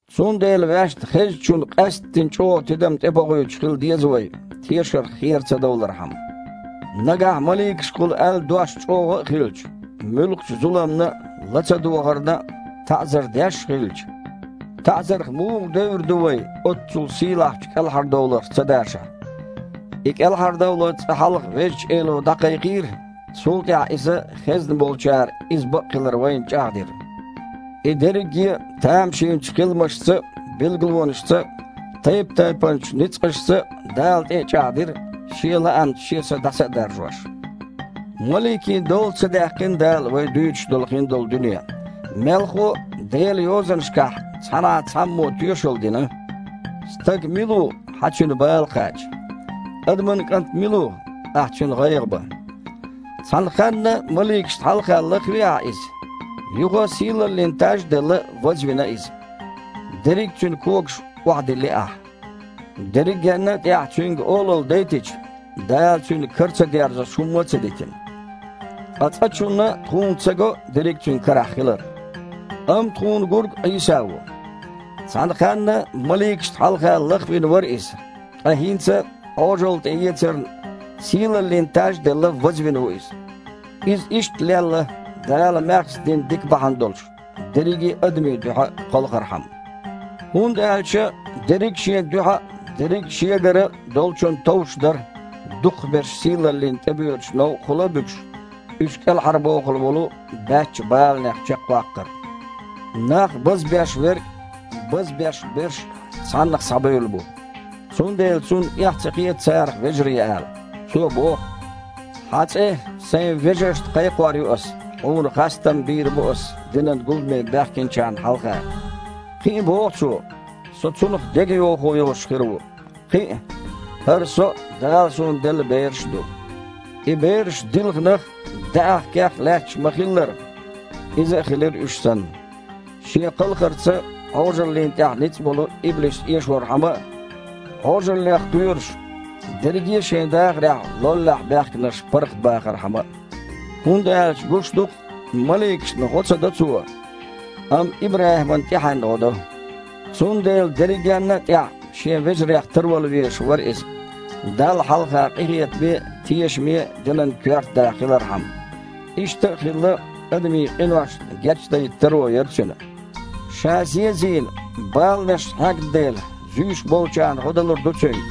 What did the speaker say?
Цундела ваьшна хезначунна къаьсттина чІогІа тидам тІебохуьйтуш хила деза вай, тешарх хера ца довлархьама. Нагахь маликашкахула аьлла дош чІогІа а хилча, муьлххачу зуламна а, лацадогІарна а таІзар деш а хилча, таІзарх муха девр ду вай, оццул сийлахьчу кІелхьардовларх ца дашахь? И кІелхьардовлар цкъа хьалха Везачу Эло дІакхайкхийра, цул тІаьхьа Иза хезнаболчара иза бакъ хилар вайна чІагІдира. И дерриге а тамашийнчу хиламашца а, билгалонашца а, тайп-тайпанчу ницкъашца а Дала тІе а чІагІдира, Шен лаамца Шен Са дІаса а даржош. Маликийн дола ца даьккхина Дала вай дуьйцуш долу хиндолу дуьне. Мелхо а, Делан Йозанашкахь цхьанхьа цхьаммо тоьшалла дина: «Стаг мила ву, Хьан цуьнан бала кхача? Адаман кІант мила ву, Ахьа цуьнан гІайгІа бан? Цхьана ханна маликашна хьалха лахви Ахьа иза. Юха, сийлаллин таж а делла, вазвина иза. Дерриг а цуьнан когашка охьадилли Ахьа». Дерригенна а тІехь цуьнга олалла дайтича, Дала цуьнан кара ца дерзош хІумма а ца дитина. Ткъа цкъачунна тхуна ца го дерриг а цуьнан карахь хилар. Амма тхуна гург Іийса ву. «Цхьана ханна маликашна хьалха лахвина» вара Иза, ткъа хІинца, Іожалла тІеэцарна, «сийлаллин таж а делла, вазвина ву Иза». Иза иштта лелла, Дала маьхза дина дика бахьана долуш, дерриге а адамийн дуьхьа кхалхархьама. ХІунда аьлча дерриг а Шен дуьхьа а, дерриг а Шегара а Долчунна товш дара, дукхахберш сийлаллина тІебоьдучу новкъахула а буьгуш, уьш кІелхьарбохуш волу Баьчча баланех чекхваккхар. Нах базбеш Верг а, базбеш берш а Цхьаннах схьабевлла бу, цундела Цунна эхь ца хета царах вежарий ала. Цо боху: «Хьан цІе Сайн вежаршна кхайкхор ю Аса, Хьуна хастам бийр бу Аса динан гуламе баьхкинчарна хьалха». Кхин а боху Цо: «Со Цунах дегайовхо йолуш хир ву». Кхин а: «ХІара Со а, Дала Суна делла бераш а ду». И бераш дилханах а, даьІахкех а лаьтташ ма-хиллара, Иза а хилира уьш санна, Шен кхалхарца Іожаллина тІехь ницкъ болу иблис эшорхьама а, Іожаллех кхоьруш, дерриге а шайн дахарехь лоллехь баьхкинарш паргІатбахархьама а. ХІунда аьлча, гуш ду-кх, маликашна гІо ца до Цо, амма ИбрахІиман тІаьхьенна гІо до. Цундела дерригенна а тІехь Шен вежарех тарвала везаш вара Иза, Далла хьалха къинхетаме а, тешаме а динан коьрта да хилархьама. Иштта а хилла, адамийн къиношна гечдайта таро яра Цуьнан. Ша, зен а зийна, баланаш хьегна дела, зуьйш болчарна гІо далур ду Цуьнга.